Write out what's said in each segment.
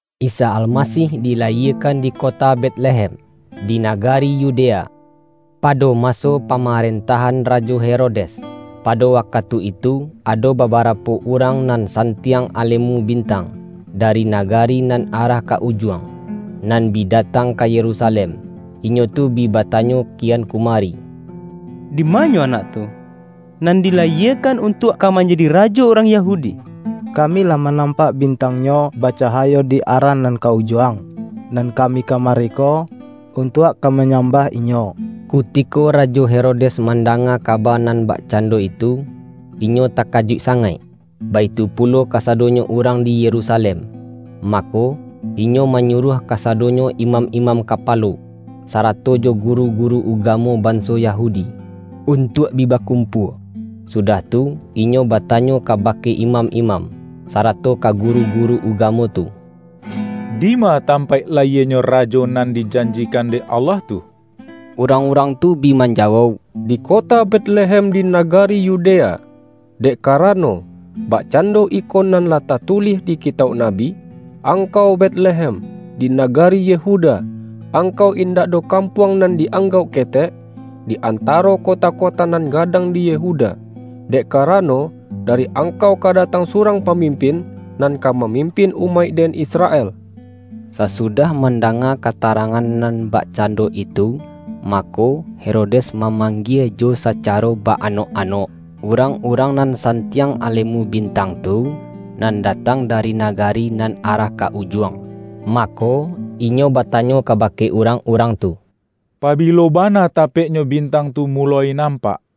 Isa Almasih dilayiekan di kota Betlehem, di nagari Yudea, pado maso pamarentahan Rajo Herodes. Pado wakatu itu, ado babarapo urang nan santiang alemu bintang, dari na-gari nan arah ka Ujuang, nan bi da-tang ka Yerusalem. Inyo tu bi bata-nyo kian kumari,”Dimanyo Anak tu, nan dilayiekan untuak ka manjadi Ra-jo urang Yahudi? Kami lah manampak bintang-Nyo bacahayo di arah nan ka Ujuang, nan kami kamari ko, untuak ka manyambah Inyo.” Kutiko Rajo Herodes mandanga ka-ba nan bakcando itu, inyo takajuik sa-ngaik, baitu pulo kasadonyo urang di Yerusalem. Mako, inyo manyuruah kasadonyo imam-imam kapalo, sara-to jo guru-guru ugamo banso Yahudi, untuak bi bakumpua. Sudah tu, inyo batanyo kabake imam-imam, sarato ka guru-guru ugamo tu,”Dima tam-paik layienyo Rajo nan dijanjikan dek Allah tu?” Urang-urang tu bi manjawauk,”Di kota Betlehem di nagari Yudea. Dek karano, bakcando iko nan lah tatulih di kitauk nabi, ’Angkau Betlehem, di nagari Yehuda, angkau indak doh kampuang nan di-anggauk ketek, di antaro kota-kota nan gadang di Yehuda. Dek karano, dari angkau ka datang surang pamimpin, nan ka mamimpin umaik-Den Israel.’” Sasudah mandanga katarangan nan bakcando itu, mako, Herodes mamang-gie jo sacaro ba-anok-anok, urang-urang nan santiang alemu bintang tu, nan datang dari nagari nan arah ka Ujuang. Mako, inyo batanyo kaba-ke urang-urang tu, pabilo bana tapek-nyo bintang tu muloi nampak?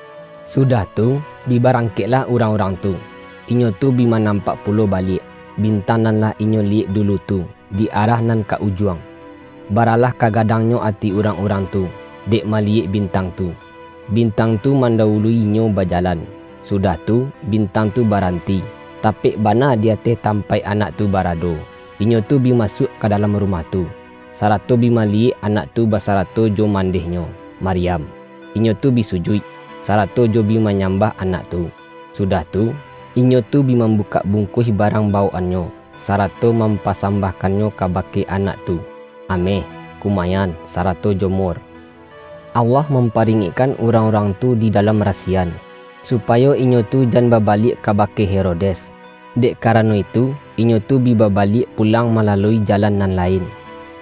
Sudah tu, bi barangkeklah urang-urang tu. Inyo tu bi manampak pulo baliak, bintang nan lah inyo liyek du-lu tu, di arah nan ka Ujuang. Baralah kagadangnyo ati urang-urang tu, dek maliyek bintang tu! Bintang tu man-dawulu-inyo bajalan, sudah tu, bin-tang tu baranti, tapek bana di ateh tampaik Anak tu barado. Inyo tu bi masuak ka dalam rumah tu, sarato bi maliyek Anak tu basarato jo mandeh-Nyo, Maryam. Inyo tu bi sujuik, sara-to jo bi manyambah Anak tu, sudah tu, inyo tu bi mambukak bungkuih barang bawok-annyo, sarato mampa-sambahkannyo kabake Anak tu, ameh, kumayan, sarato jo mur. Allah mam-paringekkan urang-urang tu di da-lam rasiyan, supayo inyo tu jan ba-baliak kabake Herodes. Dek karano itu, inyo tu bi babaliak pulang mala-lui jalan nan lain.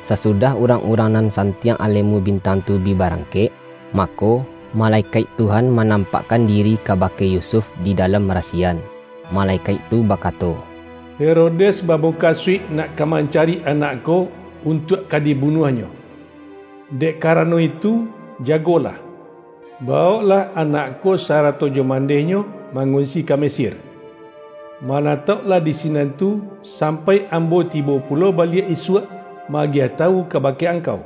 Sasudah urang-urang nan santiang alemu bintang tu bi barangkek, mako, malekaik Tuhan manampakkan diri kabake Yusuf di dalam rasiyan. Ma-lekaik tu bakato,”Herodes bamuka-suik nak ka mancari Anak ko, untuak ka dibunuahnyo. Dek karano itu, jago-lah, bawoklah Anak ko sarato jo man-deh-Nyo mangunsi ka Mesir. Mana-tauklah di sinan tu, sampai Ambo tibo pulo baliak isuak, ma-agiah tawu ka-bake angkau.”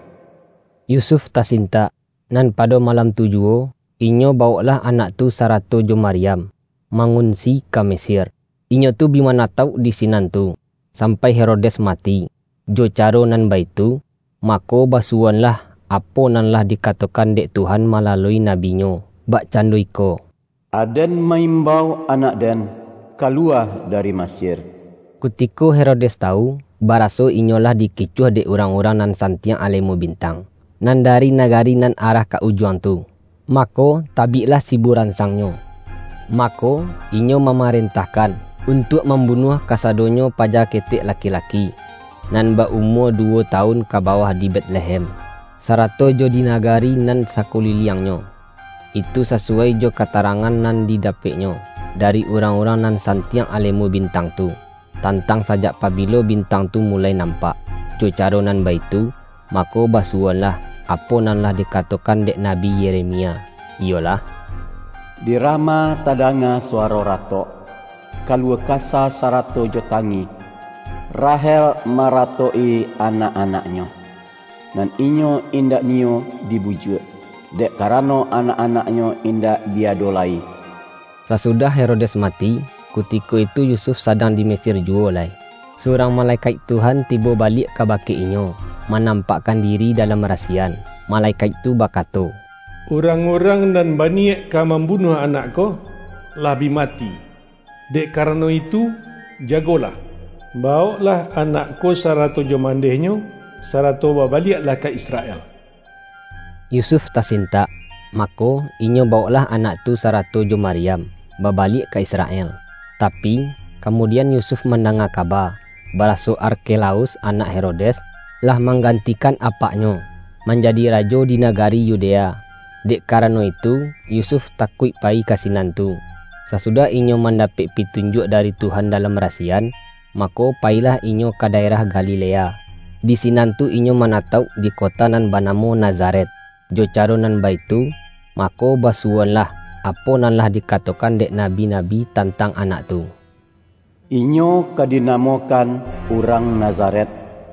Yusuf tasintak, nan pado malam tu juwo, inyo bawoklah Anak tu sa-rato jo Maryam, mangunsi ka Mesir. Inyo tu bi manatauk di sinan tu, sampai Herodes mati. Jo caro nan baitu, mako basuwo-anlah, apo nan lah dikatokan dek Tuhan malalui nabi-Nyo, bakcando iko,”Aden ma-imbau Anak-Den kalu-wa dari Mesir.” Kutiko Herodes tawu, baraso inyo lah dikicuah, dek urang-urang nan san-tiang alemu bintang, nan dari nagari nan arah ka Ujuang tu, mako tabiklah siburansangnyo. Mako, inyo mamaren-tahkan, untuak mambunuah kasado-nyo paja ketek laki-laki, nan ba-umua duwo tawun ka bawah di Betlehem, sarato jo di nagari nan sakuliliangnyo. Itu sasuwai jo katarangan nan dida-peknyo, dari urang-urang nan santiang alemu bintang tu, tantang sajak pabi-lo bintang tu muloi nampak. Jo caro nan baitu, mako basu-woanlah, apo nan lah dikatokan dek Nabi Yeremia, iyolah, ”Di Rama tadanga suwaro ratok, kaluah kasah sarato jo tangih. Rahel maratok-i anak-anaknyo, nan inyo indak niyo dibujuak, dek karano anak-anaknyo indak bi ado lai.” Sasudah Herodes mati, kutiko itu Yusuf sadang di Mesir juwo lai, surang malekaik Tuhan tibo baliak kabake inyo, manampakkan diri dalam rasi-yan. Malekaik tu bakato,”Urang-urang nan baniyaik ka mambunuah Anak ko, lah bi mati. Dek karano itu, jagolah, bawoklah Anak ko sarato jo mandeh-Nyo, sarato babaliaklah ka Israel.” Yusuf tasintak, mako, inyo bawoklah Anak tu sarato jo Maryam, babaliak ka Israel. Tapi, kamudian Yusuf mandanga kaba, baraso Arkelaus anak Herodes, lah manggantikan apaknyo, manjadi rajo di nagari Yudea. Dek karano itu, Yusuf takuik payi ka sinan tu. Sasudah inyo mandapek pitunjuak dari Tuhan dalam rasiyan, mako payilah inyo ka daerah Galilea. Di sinan tu inyo ma-natauk di kota nan banamo Nazaret. Jo caro nan baitu, mako basuwoanlah, apo nan lah dikatokan dek nabi-nabi tantang Anak tu:”Inyo ka dina-mokan Urang Nazaret.”